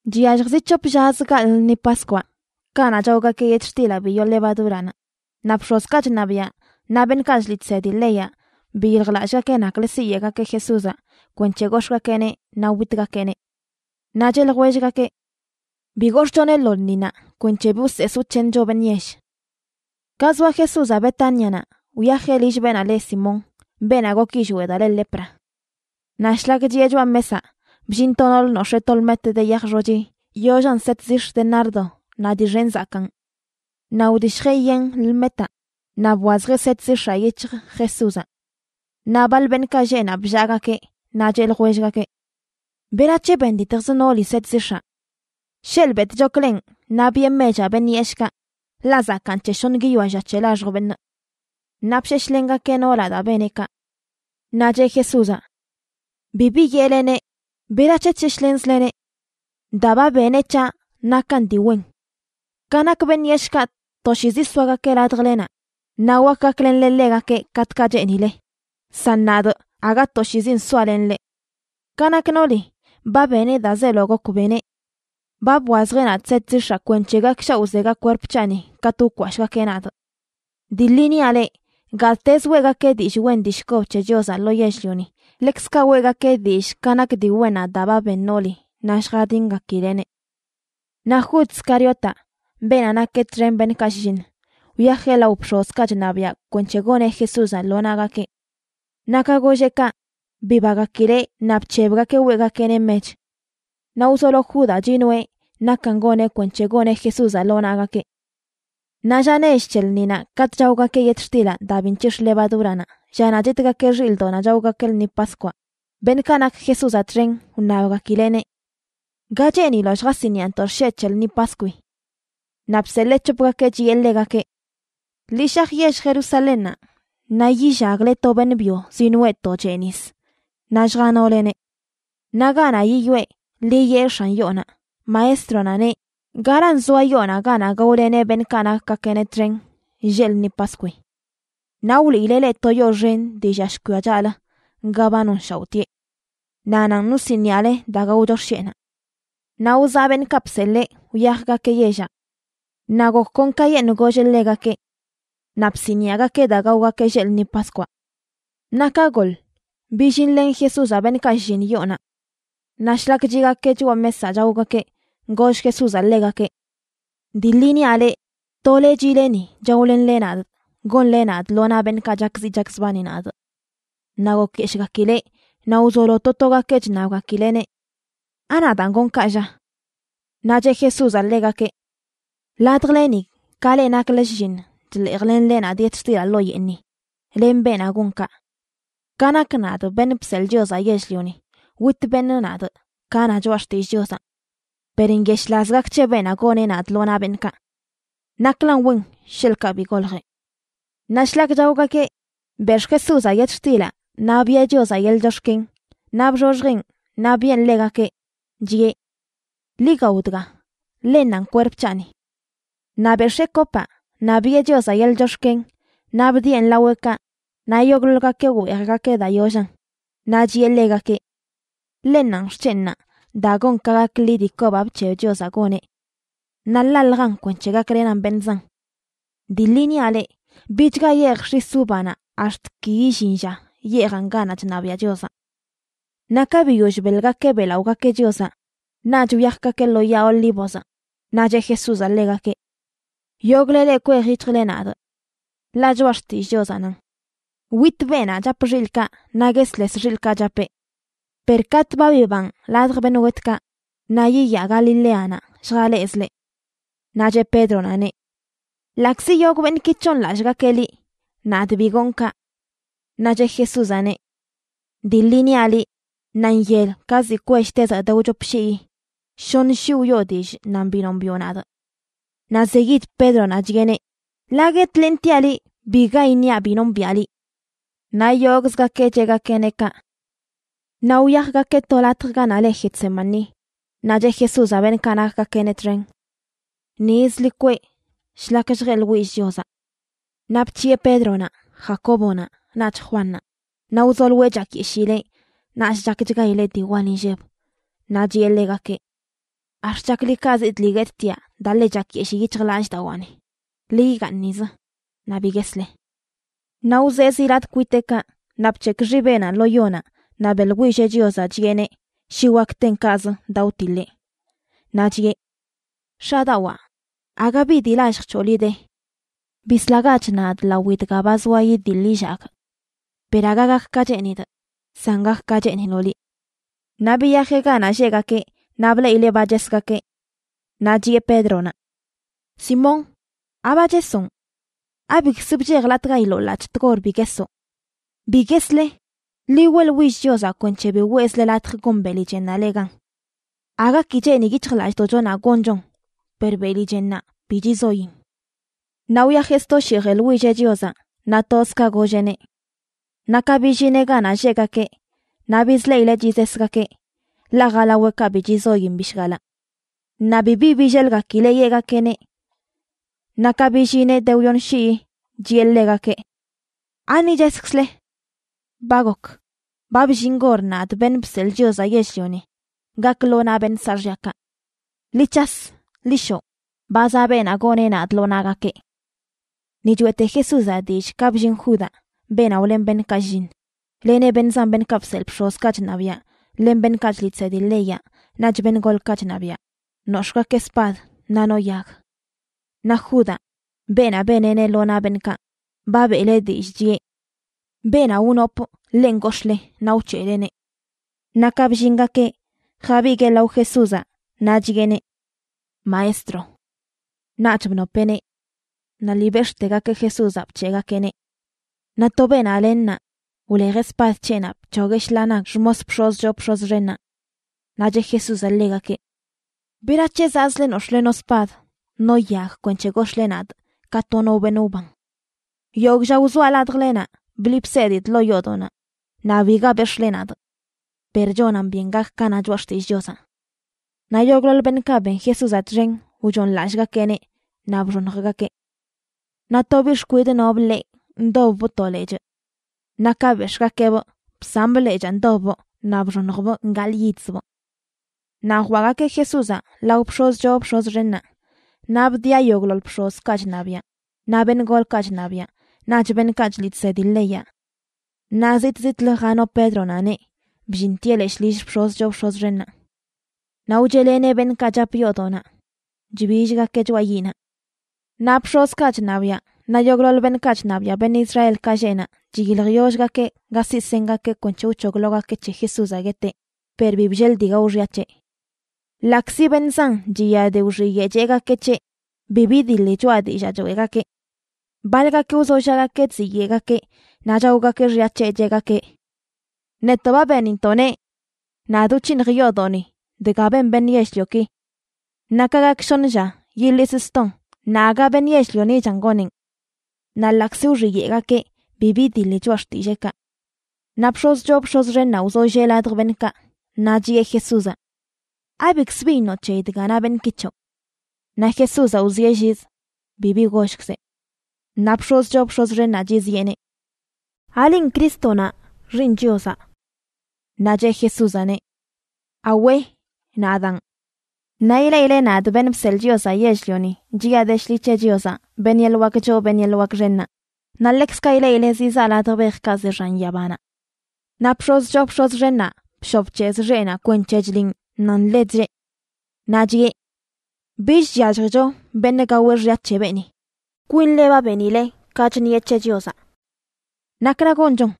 Chyallj zi c̱hop llazə gaḻꞌ lṉi Paskwaꞌ, kanaꞌ chaogakeꞌ yetxtilaꞌ bi yoo levadúranaꞌ, naꞌ bx̱ozkaꞌ chṉabiaꞌ naꞌ beṉꞌkaꞌ chliꞌ chsedi leyaꞌ biyiljlallꞌgakeꞌ naklə siyeꞌgakeꞌ Jesúzaꞌ kwenc̱he gox̱ꞌgakeꞌneꞌ naꞌ witgakeꞌneꞌ. Naꞌ cheꞌ ljwellgakeꞌ: ―Bi gox̱ꞌchoneꞌ lo lṉinaꞌ kwenc̱he bi wsees wc̱heeṉcho beṉꞌ yell. Ka zoa Jesúzaꞌ Betánianaꞌ, wyajeꞌ lill beenaꞌ le Simón, beenaꞌ gok yillweꞌ daa le lepra. Naꞌ shlak chiꞌe choꞌa mesaꞌ, bllin to noolə nox̱ee to lmet de yaj xochi yoollan set zix̱ de nardo naꞌ dii xen zakaan. Naꞌ wdishjeꞌ yen lmetaꞌ naꞌ bwazjeꞌ set zix̱aꞌ yic̱hj Jesúzaꞌ. Naꞌ baḻ beṉꞌkaꞌ lleꞌ naꞌ bllaagakeꞌ, naꞌ cheꞌ ljwellgakeꞌ: ―¿Berac̱he benditjz nooli set zix̱aꞌ? Sheḻꞌ betꞌchokleꞌn naꞌ biꞌe mechaꞌ beṉꞌ yeshꞌkaꞌ, ḻaꞌ zakaan c̱he shoṉ guiyoa lla c̱he laxj beṉꞌ. Naꞌ bsheshlengakeꞌ noolaꞌ daa beneꞌ kaꞌ. Naꞌ cheꞌ Jesúzaꞌ: ―Bibi yeꞌleneꞌ. ¿Berac̱he chsheshlenzleneꞌ? Daa ba beneꞌ c̱haꞌ nakan dii wen. Ka nak beṉꞌ yeshꞌkaꞌ, toshiizi soagakeꞌ ladjlenaꞌ, naꞌ wak gaklenle ḻegakeꞌ katꞌkaꞌ cheenileꞌ; san nadꞌ, aga toshiizin soalenꞌ leꞌ. Ka nak nooli ba beneꞌ daa zeelo gok beneꞌ. Ba bwazjeꞌ nadꞌ set zix̱aꞌ kwenc̱he gakshaoꞌzega kwerp c̱haꞌni katꞌ wkwashꞌgakeꞌ nadꞌ. Dii ḻi niaꞌ leꞌ, gattezə weꞌgakeꞌ dillꞌ wen dillꞌ kob c̱he Chiozaꞌ lo yell-lioni, ḻekzkaꞌ weꞌgakeꞌ dillꞌ ka nak dii wennaꞌ daa ba ben nooli naꞌ lljadingakileꞌneꞌ. Naꞌ Jud Scariotaꞌ, beenaꞌ nakeꞌ txen beṉꞌkaꞌ shlliṉ, wyajeꞌ lao bx̱ozkaꞌ chṉabiaꞌ kwenc̱he goneꞌ Jesúzaꞌ lo naꞌgakeꞌ. Naꞌ ka golleꞌ kaꞌ, bibagakileꞌ naꞌ bc̱hebgakeꞌ weꞌgakeꞌneꞌ mech. Naꞌ wzolo Judaꞌ chinoeꞌ nakan goneꞌ kwenc̱he goneꞌ Jesúzaꞌ lo naꞌgakeꞌ. Naꞌ lla nech c̱he lṉinaꞌ katꞌ chaogakeꞌ yetxtilaꞌ daa bi nc̱hix̱ə levadúranaꞌ, llanaꞌ chitgakeꞌ xilꞌdoꞌnaꞌ chaogakeꞌ lṉi Paskwaꞌ, beṉꞌkaꞌ nak Jesúzaꞌ txen wṉabgakileꞌneꞌ: ―¿Ga cheeniloꞌ lljasiniꞌantoꞌ xsheꞌ c̱he lṉi Paskwi? Naꞌ bseḻee c̱hopgakeꞌ, chiꞌe ḻegakeꞌ: ―Ḻi shaj yell Jerusalénnaꞌ naꞌ yillagle to beṉꞌ byo zinoꞌe to chee nis, naꞌ lljanóleneꞌ. Naꞌ ganaꞌ yiyoꞌe, ḻi yee x̱an yoonaꞌ: “Maestronaꞌ neꞌ: ¿Garan zoa yoonaꞌ ganaꞌ gaoleneꞌ beṉꞌkaꞌ nakgakeꞌneꞌ txen lleꞌ lṉi Paskwi?” Naꞌ wliileꞌ leꞌ to yoo xen dii llia shkwia chaꞌlə ga ba nonshaoꞌtieꞌ. Naꞌ nanꞌ wsiniꞌale daa gaocho xsheꞌnaꞌ. Naꞌ wzaꞌ beṉꞌkaꞌ bseḻee, wyajgakeꞌ yellaꞌ. Naꞌ gok kon kayeṉꞌ golleꞌ ḻegakeꞌ. Naꞌ bsiniꞌagakeꞌ daa gaogakeꞌ lleꞌ lṉi Paskwaꞌ. Naꞌ ka goḻ billinlen Jesúzaꞌ beṉꞌkaꞌ shlliṉ yoonaꞌ. Naꞌ shlak chiꞌgakeꞌ choꞌa mesaꞌ chaogakeꞌ, goll Jesúzaꞌ ḻegakeꞌ: ―Dii ḻi niaꞌ leꞌ, tole chiꞌle ni chaolenle nadꞌ gonle nadꞌ lo naꞌ beṉꞌkaꞌ chakziꞌ chakzbani nadꞌ. Naꞌ gokyeshꞌgakileꞌ, naꞌ wzolo to togakeꞌ chṉabgakileꞌneꞌ: ―¿Anadaan gonꞌ kaꞌ, lla? Naꞌ cheꞌ Jesúzaꞌ ḻegakeꞌ: ―Ladjleni, ka leꞌ nakle shlliṉ chḻeejlenle nadꞌ yetxtilaꞌ ḻoo yeeṉi, len beenaꞌ gon kaꞌ. Ka nak nadꞌ, Beṉꞌ Bseḻꞌ Chiozaꞌ Yell-lioni, wit beṉꞌ nadꞌ ka na Choꞌa Xtillꞌ Chiozaꞌ. Per nyeshꞌlaz gak c̱he beenaꞌ goneꞌ nadꞌ lo naꞌ beṉꞌkaꞌ. Naklan wen sheḻꞌkaꞌ bi goljeꞌ. Naꞌ shlak chaogakeꞌ, bex̱ꞌ Jesúzaꞌ yetxtilaꞌ naꞌ biꞌe Chiozaꞌ yeḻꞌ chox̱ken, naꞌ bxoxjeꞌn naꞌ biꞌen ḻegakeꞌ, chiꞌe: ―Ḻi gao dga. Ḻennanꞌ kwerp c̱haꞌni. Naꞌ bex̱ee kopaꞌ, naꞌ biꞌe Chiozaꞌ yeḻꞌ chox̱ken naꞌ bdieꞌn laweꞌkaꞌ naꞌ yogꞌḻoḻgakeꞌ weejgakeꞌ daa yollan. Naꞌ chiꞌe ḻegakeꞌ: ―Ḻennanꞌ xc̱henꞌnaꞌ daa gon ka gak ḻi dii kobaꞌ bc̱heb Chiozaꞌ goneꞌ. Naꞌ ḻaljan kwenc̱he gaklenan beṉꞌ zan. Dii ḻi niaꞌ leꞌ, bichga yeejꞌ x̱is uvanaꞌ ax̱t ki illin lla yeejaꞌn ganaꞌ chṉabiaꞌ Chiozaꞌ. Naꞌ ka biyoll beḻgakeꞌ beꞌlaꞌogakeꞌ Chiozaꞌ, naꞌch wyajgakeꞌ lo Yaa Olívozaꞌ. Naꞌ cheꞌ Jesúzaꞌ ḻegakeꞌ: ―Yogꞌle leꞌ kwej yic̱hjle nadꞌ. Ḻaꞌ Choꞌa Xtillꞌ Chiozaꞌ nan: “Witꞌ beenaꞌ chap xilꞌkaꞌ, naꞌ guesles xilꞌkaꞌ chapeꞌ.” Per katꞌ ba bibanꞌ ladj beṉꞌ wetkaꞌ, naꞌ yiyaa Galileanaꞌ lljalezꞌ leꞌ. Naꞌ cheꞌ Pédronaꞌneꞌ: ―Ḻaꞌkzi yogꞌ beṉꞌki c̱hooṉlallꞌgakeꞌ liꞌ, nadꞌ bi gonꞌ kaꞌ. Naꞌ cheꞌ Jesúzaꞌneꞌ: ―Dii ḻi niaꞌ liꞌ, ṉaanyel ka ziꞌ kwell tezaꞌ de wchop shii, shoṉ shii wiꞌo dillꞌ nan bi nombiꞌo nadꞌ. Naꞌ zeyid Pédronaꞌ chiꞌeneꞌ: ―Ḻaꞌ guetlentiaꞌ liꞌ, biga iṉiaꞌ bi nombiꞌa liꞌ. Naꞌ yogꞌzgakeꞌ cheꞌgakeꞌneꞌ kaꞌ. Naꞌ wyajgakeꞌ to latj ganaꞌ le Getsemaní, naꞌ cheꞌ Jesúzaꞌ beṉꞌkaꞌ nakgakeꞌneꞌ txen: ―Nizə ḻi kweꞌ shlak lljeꞌḻwillꞌ Chiozaꞌ. Naꞌ bc̱hiꞌe Pédronaꞌ, Jacóbonaꞌ, naꞌch Juannaꞌ, naꞌ wzoloeꞌ chakyeshileꞌ naꞌch chakchgaileꞌ dii wal inlleb. Naꞌ chiꞌe ḻegakeꞌ: ―Ax̱t chaklikazidꞌ lii guettiaꞌ daa ḻe chakyeshii yic̱hjlallꞌdawaani. Ḻi igaaṉ nizə naꞌ bi guesle. Naꞌ wzee zi latꞌ kwiteꞌkaꞌ, naꞌ bc̱hekꞌ xibeꞌnaꞌ lo yonaꞌ naꞌ beꞌḻwilleꞌ Chiozaꞌ chiꞌeneꞌ shi wak ten kaꞌzə daa wtiḻeꞌ. Naꞌ chiꞌe: ―X̱adawaa, aga bi dii lallj c̱hoꞌ liꞌ de. Bislagach nadꞌ lawi dga ba zoa idiḻ illagꞌ. Per aga gak ka cheenidꞌ, san gak ka cheeniloꞌ liꞌ. Naꞌ biyajeꞌ ganaꞌ lleꞌgakeꞌ naꞌ bleꞌileꞌ ba chesgakeꞌ. Naꞌ chiꞌe Pédronaꞌ: ―Simón, ¿Aba chesonꞌ? ¿Abikzə bchejlatꞌgailoꞌ ḻaꞌc̱hꞌ tgor bi guesoꞌ? Bi guesle, ḻi weꞌḻwill Chiozaꞌ kwenc̱he bi weꞌzle latj gon beli chennaꞌ leꞌ gan. Aga ki cheeni yic̱hjlallꞌdoꞌchonaꞌ gonchon per beli chennaꞌ bi chizoin. Naꞌ wyajeꞌ sto shii jeḻwilleꞌ Chiozaꞌ, naꞌ toz ka golleꞌneꞌ. Naꞌ ka billineꞌ ganaꞌ lleꞌgakeꞌ, naꞌ bizleꞌileꞌ chizesgakeꞌ, ḻaꞌ jalaweꞌkaꞌ bi chizoyin bishgalaꞌ. Naꞌ bibi billelgakileꞌ yeꞌgakeꞌneꞌ. Naꞌ ka billineꞌ de wyoṉ shii, chiꞌe ḻegakeꞌ: ―¿Ani cheskzle? Ba gok. Ba bllin gor nadꞌ, Beṉꞌ Bseḻꞌ Chiozaꞌ Yell-lioni, gakꞌ lo naꞌ beṉꞌ saaxyakaꞌ. Ḻi c̱has. Ḻi shoꞌ. Ba zaꞌ beenaꞌ goneꞌ nadꞌ lo naꞌgakeꞌ. Ni choeꞌte Jesúzaꞌ dillꞌ ka bllin Judaꞌ, beenaꞌ wlen beṉꞌkaꞌ shlliṉ, leneꞌ beṉꞌ zan beṉꞌkaꞌ bseḻꞌ bx̱ozkaꞌ chṉabiaꞌ len beṉꞌkaꞌ chliꞌ chsedi leyaꞌ naꞌch beṉꞌ golkaꞌ chṉabiaꞌ, nox̱ꞌgakeꞌ spad, naꞌ no yag. Naꞌ Judaꞌ, beenaꞌ beneꞌneꞌ lo naꞌ beṉꞌkaꞌ, ba beꞌleꞌ dillꞌ, chiꞌe: ―Beenaꞌ wnopꞌ, ḻenꞌ gox̱ꞌle, naꞌ wc̱heꞌleneꞌ. Naꞌ ka bllingakeꞌ, jabiguee lao Jesúzaꞌ naꞌ chiꞌeneꞌ: ―¡Maestro! Naꞌch bnopeꞌneꞌ. Naꞌ lii bex̱ꞌtegakeꞌ Jesúzaꞌ bc̱heꞌgakeꞌneꞌ. Naꞌ to beenaꞌ len naꞌ wlejeꞌ spad c̱heꞌnaꞌ bc̱hogueꞌ shḻaa nag xmos bx̱oz choo bx̱oz xennaꞌ. Naꞌ cheꞌ Jesúzaꞌ ḻegakeꞌ: ―¿Berac̱he zaꞌzle nox̱ꞌle no spad no yag kwenc̱he gox̱ꞌle nadꞌ ka to no beṉꞌ wban? Yogꞌ lla wzoaꞌ ladjlenaꞌ bliꞌ bsedidꞌ ḻoo yoodoꞌnaꞌ, naꞌ biga bex̱ꞌle nadꞌ. Per chonan byen gak ka na Choꞌa Xtillꞌ Chiozaꞌ. Naꞌ yogꞌḻoḻ beṉꞌkaꞌ ben Jesúzaꞌ txen wchooṉlallꞌgakeꞌneꞌ naꞌ bxoṉjgakeꞌ. Naꞌ to biꞌ xkwidꞌ nobꞌ ḻeꞌ ndobbꞌ to lechꞌ. Naꞌ ka bex̱ꞌgakeꞌbꞌ bsamꞌ lechaa ndobbꞌ naꞌ bxoṉjbꞌ gaḻꞌyidzbꞌ. Naꞌ jwaꞌgakeꞌ Jesúzaꞌ lao bx̱oz choo bx̱oz xennaꞌ, naꞌ bdiꞌa yogꞌḻoḻ bx̱ozkaꞌ chṉabiaꞌ naꞌ beṉꞌ golkaꞌ chṉabiaꞌ naꞌch beṉꞌkaꞌ chliꞌ chsedi leyaꞌ. Naꞌ zitꞌ zitꞌlə jano Pédronaꞌneꞌ bllintieꞌ leshꞌ lill bx̱oz choo bx̱oz xennaꞌ. Naꞌ wcheꞌleneꞌ beṉꞌkaꞌ chap yoodoꞌnaꞌ chbillgakeꞌ choꞌa yiꞌnaꞌ. Naꞌ bx̱ozkaꞌ chṉabiaꞌ naꞌ yogꞌḻoḻ beṉꞌkaꞌ chṉabiaꞌ beṉꞌ Israelkaꞌ lleꞌ naꞌ chiyiljyollgakeꞌ ga siꞌ sengakeꞌ kwenc̱he wc̱hoglogakeꞌ c̱he Jesúzaꞌ gueteꞌ, per bi bllel dii gao xya c̱heꞌ. Ḻaꞌkzi beṉꞌ zan chiya de wxiyeꞌ cheꞌgakeꞌ c̱heꞌ, bi bidiḻi choꞌa dillaa choeꞌgakeꞌ. Baḻgakeꞌ wzollaꞌgakeꞌ chziyeꞌgakeꞌ naꞌ chaogakeꞌ xya c̱heꞌ, cheꞌgakeꞌ: ―Netoꞌ ba benintoꞌ neꞌ: “Nadꞌ wc̱hiṉj yoodoꞌni dga ben beṉꞌ yell-lioki. Naꞌ ka gak shoṉ lla yiḻisꞌ ston naꞌ aga beṉꞌ yell-lionichan goneꞌn.” Naꞌ ḻaꞌkzi wxiyeꞌgakeꞌ, bi bidiḻi choꞌa xtilleekaꞌ. Naꞌ bx̱oz choo bx̱oz xennaꞌ wzollee ladj beṉꞌkaꞌ naꞌ chiꞌe Jesúzaꞌ: ―¿Abikz bi iṉoꞌ c̱heyi dga na beṉꞌki c̱hoꞌ? Naꞌ Jesúzaꞌ wzieꞌ lliz bibi gollkzeꞌ. Naꞌ bx̱oz choo bx̱oz xennaꞌ chiziꞌeneꞌ: ―¿Alinꞌ Crístonaꞌ, Xiiṉ Chiozaꞌ? Naꞌ cheꞌ Jesúzaꞌneꞌ: ―Awe, nadaan. Naꞌ ileꞌile nadꞌ, Beṉꞌ Bseḻꞌ Chiozaꞌ Yell-lioni, chiꞌa de shḻi c̱he Chiozaꞌ, beṉꞌ yeḻꞌ wak choo beṉꞌ yeḻꞌ wak xennaꞌ, naꞌ ḻekzkaꞌ ileꞌileꞌ zizaa ladj bejkaꞌ ze xan yabanaꞌ. Naꞌ bx̱oz choo bx̱oz xennaꞌ bshoꞌ bc̱hezꞌ xeꞌnaꞌ kwenc̱he chliꞌn nan ḻe chllee. Naꞌ chiꞌe: ―Bich chyalljicho beṉꞌ gaweꞌ xya c̱he beeni. Kwinle ba benile ka chṉieꞌ c̱he Chiozaꞌ. ¿Nakra gonchon?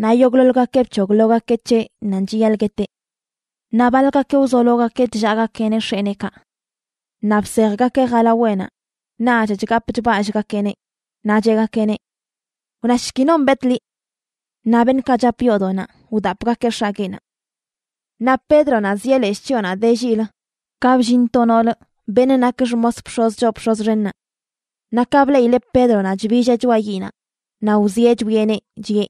Naꞌ yogꞌḻoḻgakeꞌ bc̱hoglogakeꞌ c̱heꞌ nan chiyaḻꞌ gueteꞌ. Naꞌ baḻgakeꞌ wzologakeꞌ chllaꞌgakeꞌneꞌ x̱eneekaꞌ. Naꞌ bsejgakeꞌ jalaweꞌnaꞌ naꞌch chgapꞌ chballꞌgakeꞌneꞌ, naꞌ cheꞌgakeꞌneꞌ: ―Wnashki, non bet liꞌ. Naꞌ beṉꞌkaꞌ chap yoodoꞌnaꞌ wdapꞌgakeꞌ x̱agueꞌnaꞌ. Naꞌ Pédronaꞌ zieꞌ leshꞌ chyoonaꞌ de lliꞌlə ka bllin to noolə, beṉꞌ nak xmos bx̱oz choo bx̱oz xennaꞌ. Naꞌ ka bleꞌileꞌ Pédronaꞌ chbilleꞌ choꞌa yiꞌnaꞌ, naꞌ wzieꞌ chwieꞌneꞌ chiꞌe: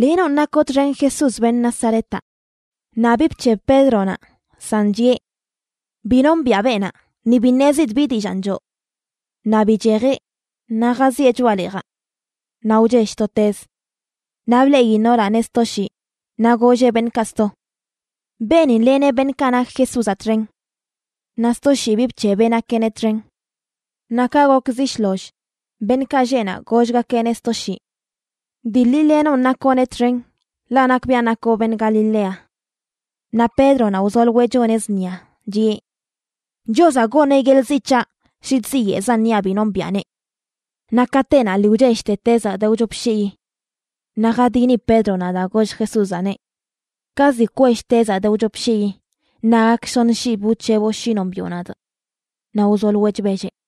―Lenonꞌ nakoꞌ txen Jesús, beṉꞌ Nazaretaꞌ. Naꞌ bi bc̱heb Pédronaꞌ, san chiꞌe: ―Bi nombiꞌa beenaꞌ, ni bi ṉezidꞌ bi dillaan choo. Naꞌ bichejeꞌ naꞌ jazieꞌ choꞌa leejaꞌ. Naꞌ wchell to tez. Naꞌ bleꞌi noolaꞌneꞌ sto shii, naꞌ golleꞌ beṉꞌkaꞌ sto: ―Beenin leneꞌ beṉꞌkaꞌ nak Jesúzaꞌ txen. Naꞌ sto shii bi bc̱hebeꞌ nakeꞌneꞌ txen. Naꞌ ka gok zi shloll, beṉꞌkaꞌ lleꞌ naꞌ gollgakeꞌneꞌ sto shii: ―Dii ḻi lenonꞌ nakoꞌneꞌ txen, ḻaꞌ nakbiaꞌ nakoꞌ beṉꞌ Galilea. Naꞌ Pédronaꞌ wzoloeꞌ choneꞌ zṉia, chiꞌe: ―Chiozaꞌ goneꞌ yeḻꞌ ziꞌ c̱haꞌ shi chziyeꞌzan niaꞌ bi nombiꞌaneꞌ. Naꞌ katenaꞌ lii wchellte tezaꞌ de wchop shii. Naꞌ jadini Pédronaꞌ daa goll Jesúzaꞌneꞌ: “Ka ziꞌ kwell tezaꞌ de wchop shii, naꞌ gak shoṉ shii bi wc̱heboꞌ shi nombiꞌo nadꞌ.” Naꞌ wzoloeꞌ chbelleꞌ.